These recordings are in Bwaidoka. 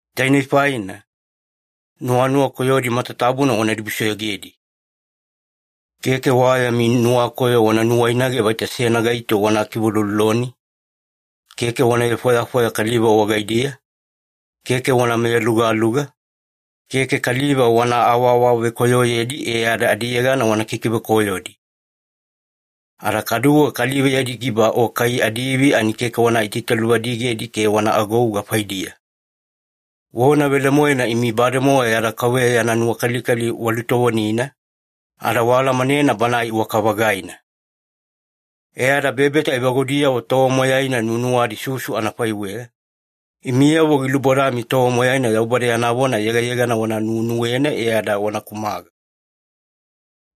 Tainei faina, nuwanuwa koyodi matatabuna wana dibusoyogedi. Keke wa yami nuwakoyo wana nuwainage vaita seyana gaito wana kiveulouloloni, keke wana vefwayafwaya kaliva wagaidiya, keke wana meyalugaluga, keke kaliva wana awaawavekoyoyedi e ada adiyegana wana kikivekoyodi. Ada kaduwe kaliva yadi giba o kai adiivi ani keke wana itaitaluvadigedi ke wana agouga faidiya. Vona velemoena imi bademowa yada Kauveya yana nuwakalikali walutovonina, ada waalamanena Banae iwaka-vagaina. E ada bebeta evagudiyavo tova moyaina nuwanuwadi susu anafaiweya, imiyavo gilubodami tova moyaina Yaubada yana vona yegayegana wana nuwenuwena e ada wana kumaga.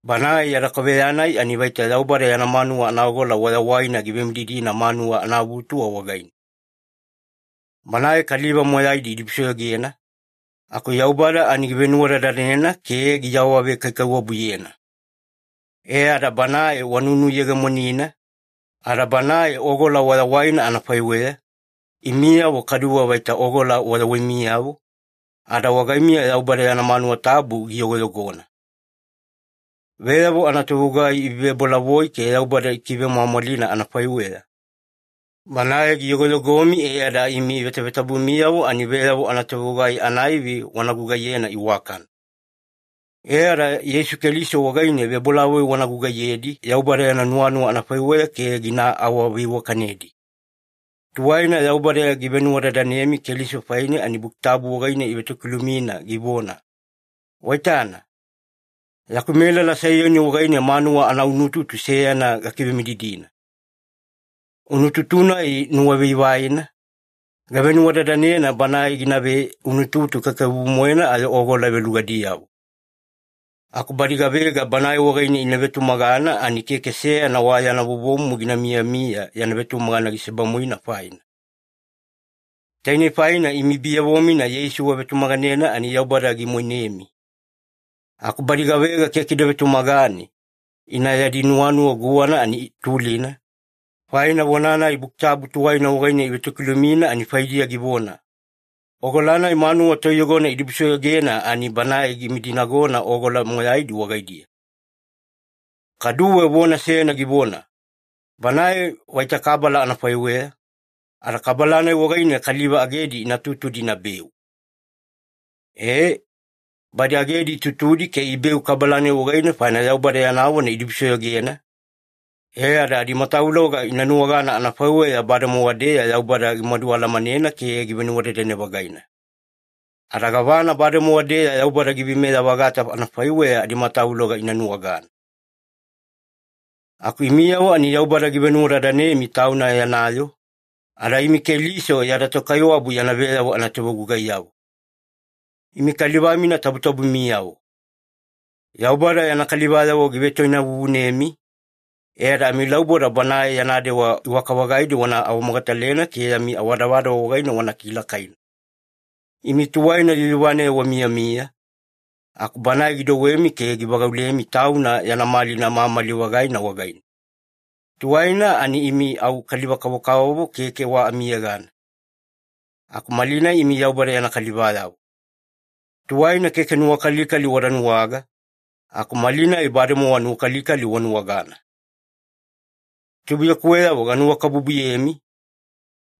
Banae yada Kauveya-nai ani vaita Yaubada yana manuwa anaogola wayawaina givemididina manuwa anaavutuwa wagaine. Banae kaliva moyaidi idibusoyogena, aku Yaubada ani givenuwadadanena ke giawavekaikaiwabuyena. E ada Banae wanunuyegemonina, ada Banae ogola wayawaina anafaiweya, imiyavo kaduwe vaita ogola wayawaimiyavo, ada wagaimiya Yaubada yana manuwa tabu giyogoyogona. Veyavo anatovegugai ivevebolavoi ke Yaubada ikivemwamwalina anafaiweya, Banae giyogoyogomi e ada imi vetavetabumiyavo ani veyavo anatovegugai anaivi wana gugaiyena iwakana. E ada Yeisu Keliso wagaine vebolavoi wana gugaiyedi Yaubada yana nuwanuwa anafaiweya ke gina awaveiwakanedi. Tuwaina Yaubada givenuwadadanemi Keliso faine ani Buki Tabu wagaine ivetokilumina givona, “Waitana, yaku melala Saiyoni wagaine manuwa anaunututu seyana gakivemididina. Unututu-nai nuwavaivaina, gavenuwadadanena Banae ginave unututu kaikaiwabu-moena ayo ogola velugadiyavo. Aku badi gavega Banae wagaine ina vetumagana ani keke seyana wa yana vovomumu gina miyamiya yana vetumagana gisebamuina faina.” Tainei faina imi biyavo-mina Yeisu wavetumaganena ani Yaubada gimoinemi. Aku badi gavega keke ida vetumagane, ina yadi nuwanuwa guwana ani tulina, faina vona-nai Buki Tabu tuwaina wagaine ivetokilumina ani faidiya givona, “Ogola-nai manuwa toiyogona idibusoyogena ani Banae gimidinagona ogola moyaidi wagaidiya.” Kaduwe vona seyana givona, “Banae vaita kabala anafaiweya, ada kabala-nai wagaine kaliva agedi ina tutudi inabeu.” E, badi agedi itutudi ke ibeu kabala-nai wagaine, faina Yaubada yana vona idibusoyogena, e ada adimatavuloga ina nuwagana anafaiweya bademowa-deya Yaubada gimadualamanena ke givenuwadadane-vagaina. Ada gavana bademowa-deya Yaubada giveimeya-vagata anafaiweya adimatavuloga ina nuwagana. Aku imiyavo ani Yaubada givenuwadadanemi Tauna yana yoo, ada imi Keliso yada Tokaiwabu yana veyavo anatovegugaiyavo. Imi kaliva-mina tabutabumiyavo. Yaubada yana kalivayavo givetoinavuvunemi, e ada amilauboda Banae yana dewa iwaka-vagaidi wana awamogatalena ke yami awadavadava wagaine wana kilakaina. Imi tuwaina yuyuvaneya wamiyamiya, aku Banae gidouwemi ke givagaulemi Tauna yana malina mamali-vagaina wagaine. Tuwaina ani imi au kaliva-kavokavovo keke wa amiyegana, aku malinai imi Yaubada yana kalivayavo. Tuwaina keke nuwakalikali wada nuwaga, aku malinai bademowa nuwakalikali wanuwagana. Tubuiyakuweyavo ganuwakabubuyemi,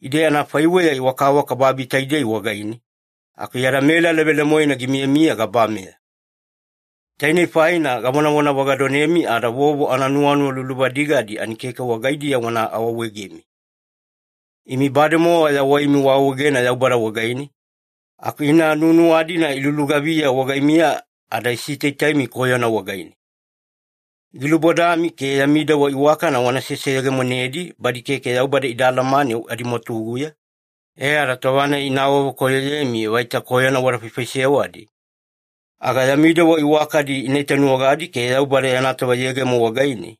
ide anafaiweya wakawaka babi taidei wagaine, aku yada melala velemoena gimiyamiya gabameya. Tainei faina gavonavona vagadonemi ada vovo ananuwanuwa luluvadigadi ani keke wagaidiya wana awaawaegemi. Imi bademowa yawaimi waawaegena Yaubada wagaine, aku ina nuwanuwa-dina ilulugaviya wagaimiya ada isitaitaimi koyona wagaine. Gilubodami ke yami dewa iwakana wana seseyegemonedi badi keke Yaubada ida alamane adimwatuguya, e ada tova-nai ina awavekoyoyemi vaita koyona wada faifaisewadi, aga yami dewa iwakadi ina itanuwagadi ke Yaubada yana tova yegemo wagaine,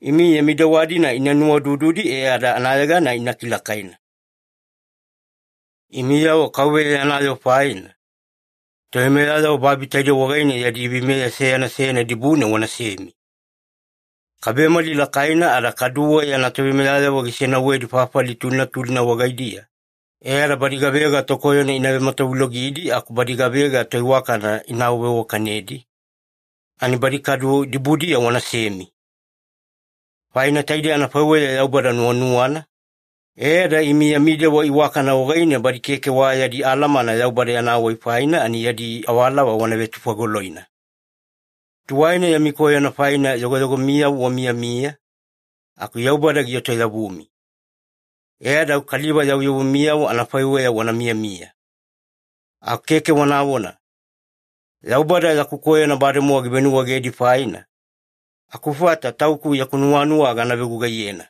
imi yami dewa-dina ina nuwaudududi e ada anayegana ina kilakaina. Imiyavo Kauveya yana yoo faina, toveimeyayavo babi taidei wagaine yadi veimeya seyana seyana dibune wanasemi. Kabemali lakaina, ada kaduwe yana toveimeyayavo gisenauwedi fafali tulina tulina wagaidiya e ada badi gavega tokoyona ina vematavulogidi aku badi gavega toiwakana ina awaveiwakanedi, ani badi kadu dibudiya wanasemi. Faina taidei anafaiweya Yaubada nuwanuwana, e ada imi yami dewa iwakana wagaine badi keke wa yadi alamana Yaubada yana wai faina ani yadi awalava wana vetufagoloina. Tuwaina yami koyona faina yogoyogomiyavo wamiyamiya, aku Yaubada gietoyavumi. E ada au kaliva yavuyavumiyavo anafaiweya wana miyamiya. Aku keke wanavona, “Yaubada yaku koyona bademowa givenuwaegedi faina, akufata tauku yaku nuwanuwa gana vegugaiyena.”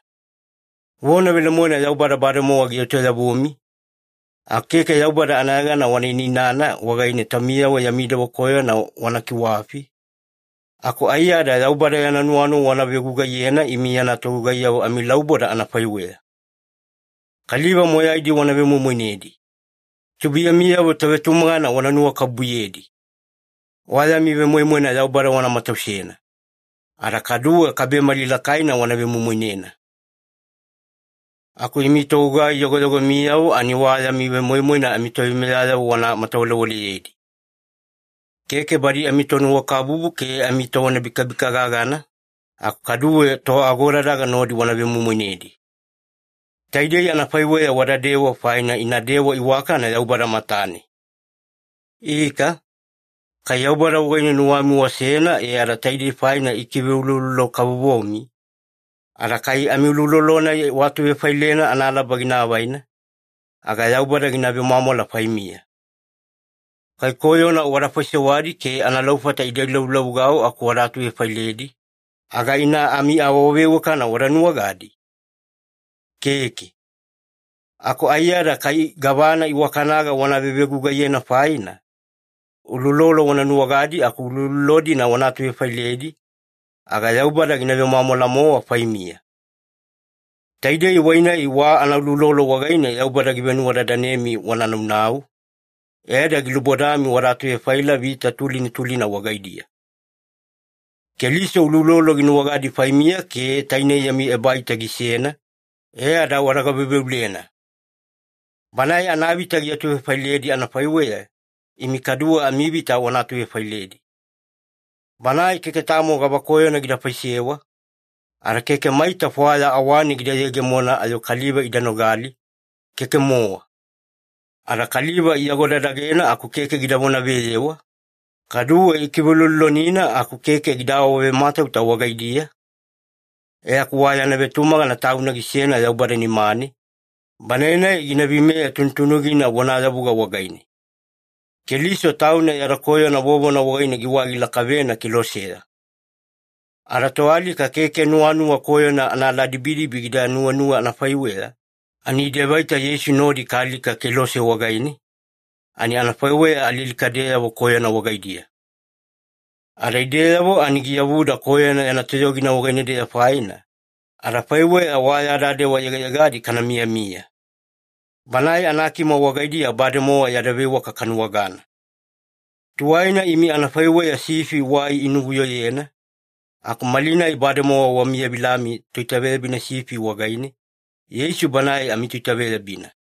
Vona velemoena Yaubada bademowa gietoyavumi, aku keke Yaubada anayegana wana inainana wagaine taumiyavo yami dewa koyona wana kiwafi, aku aiyada Yaubada yana nuwanuwa wana vegugaiyena imi yana togugaiyavo amilauboda anafaiweya. Kaliva moyaidi wana vemoimoinedi. Tubuiyamiyavo tovetumagana wana nuwakabubuyedi. Wa yami vemoimoina Yaubada wana matausena. Ada kaduwe kabemali lakaina wana vemoimoinena. Aku imi togugai yogoyogomiyavo ani wa yami vemoimoina amitoveimeyayavo wana matawalewaleyedi. Keke badi amitonuwakabubu ke amitovonabikabika gagana, aku kaduwe toagodadaga nodi wana vemoimoinedi. Taidei anafaiweya wadadewa faina ina dewa iwakana Yaubada matane. Ika, kai Yaubada wagaine nuwami wasena e ada taidei faina ikiveuloulolo-kavovomi, ada kai amiuloulolo-nai waatuvefailena analaba gina avaina, aga Yaubada gina vemwamwala faimiya. Kai koyona wada faisewadi ke analaufata ida ilavulavugau aku wada atuvefailedi, aga ina amiawaveiwakana wada nuwagadi? Keke. Aku aiyada kai gavana iwakanaga wana vevegugaiyena faina, uloulolo wana nuwagadi aku uloulolo-dina wana atuvefailedi, aga Yaubada gina vemwamwala-mowa faimiya. Taidei wai-nai wa anauloulolo wagaine Yaubada givenuwadadanemi wana naunau, e ada gilubodami wada atuvefaila vita tulina tulina wagaidiya. Keliso uloulolo ginuwagana faimiya ke tainei yami ebaita gisena, e ada wada gaveuveulena. Banae anavita giatuvefailedi anafaiweya, imi kaduwe amivita wana atuvefailedi. Banae keke tamo gavakoyona gida faisewa, ada keke maita fwaya awane gida yegemona ayo kaliva ida nogali, keke-mowa. Ada kaliva iagodadagena aku keke gida vonaveyewa, kaduwe ikiveuloulolonina aku keke gida awavematauta wagaidiya, e aku wa yana vetumagana Tauna gisena Yaubada nimane, Banae-nai gina veimeya tunutunugina vonayavuga wagaine. Keliso Tauna yada koyona vovona wagaine giwai gilakavena keloseya. Ada toalika keke nuwanuwa koyona anaaladibidibi gida nuwenuwe anafaiweya, ani ide vaita Yeisu nodi kaalika kelose wagaine, ani anafaiweya alialikadeyavo koyona wagaidiya. Ada ideyavo ani giyavuda koyona yana toyogina wagaine-deya faina, adafaiweya wa yada dewa yegayegadi kana miyamiya. Banae anakima wagaidiya bademowa yada veiwaka kanuwagana. Tuwaina imi anafaiweya sifi wai inuvuyoyena, aku malinai bademowa wamiyavilami Toitaveyabina sifi wagaine, Yeisu Banae amiToitaveyabina.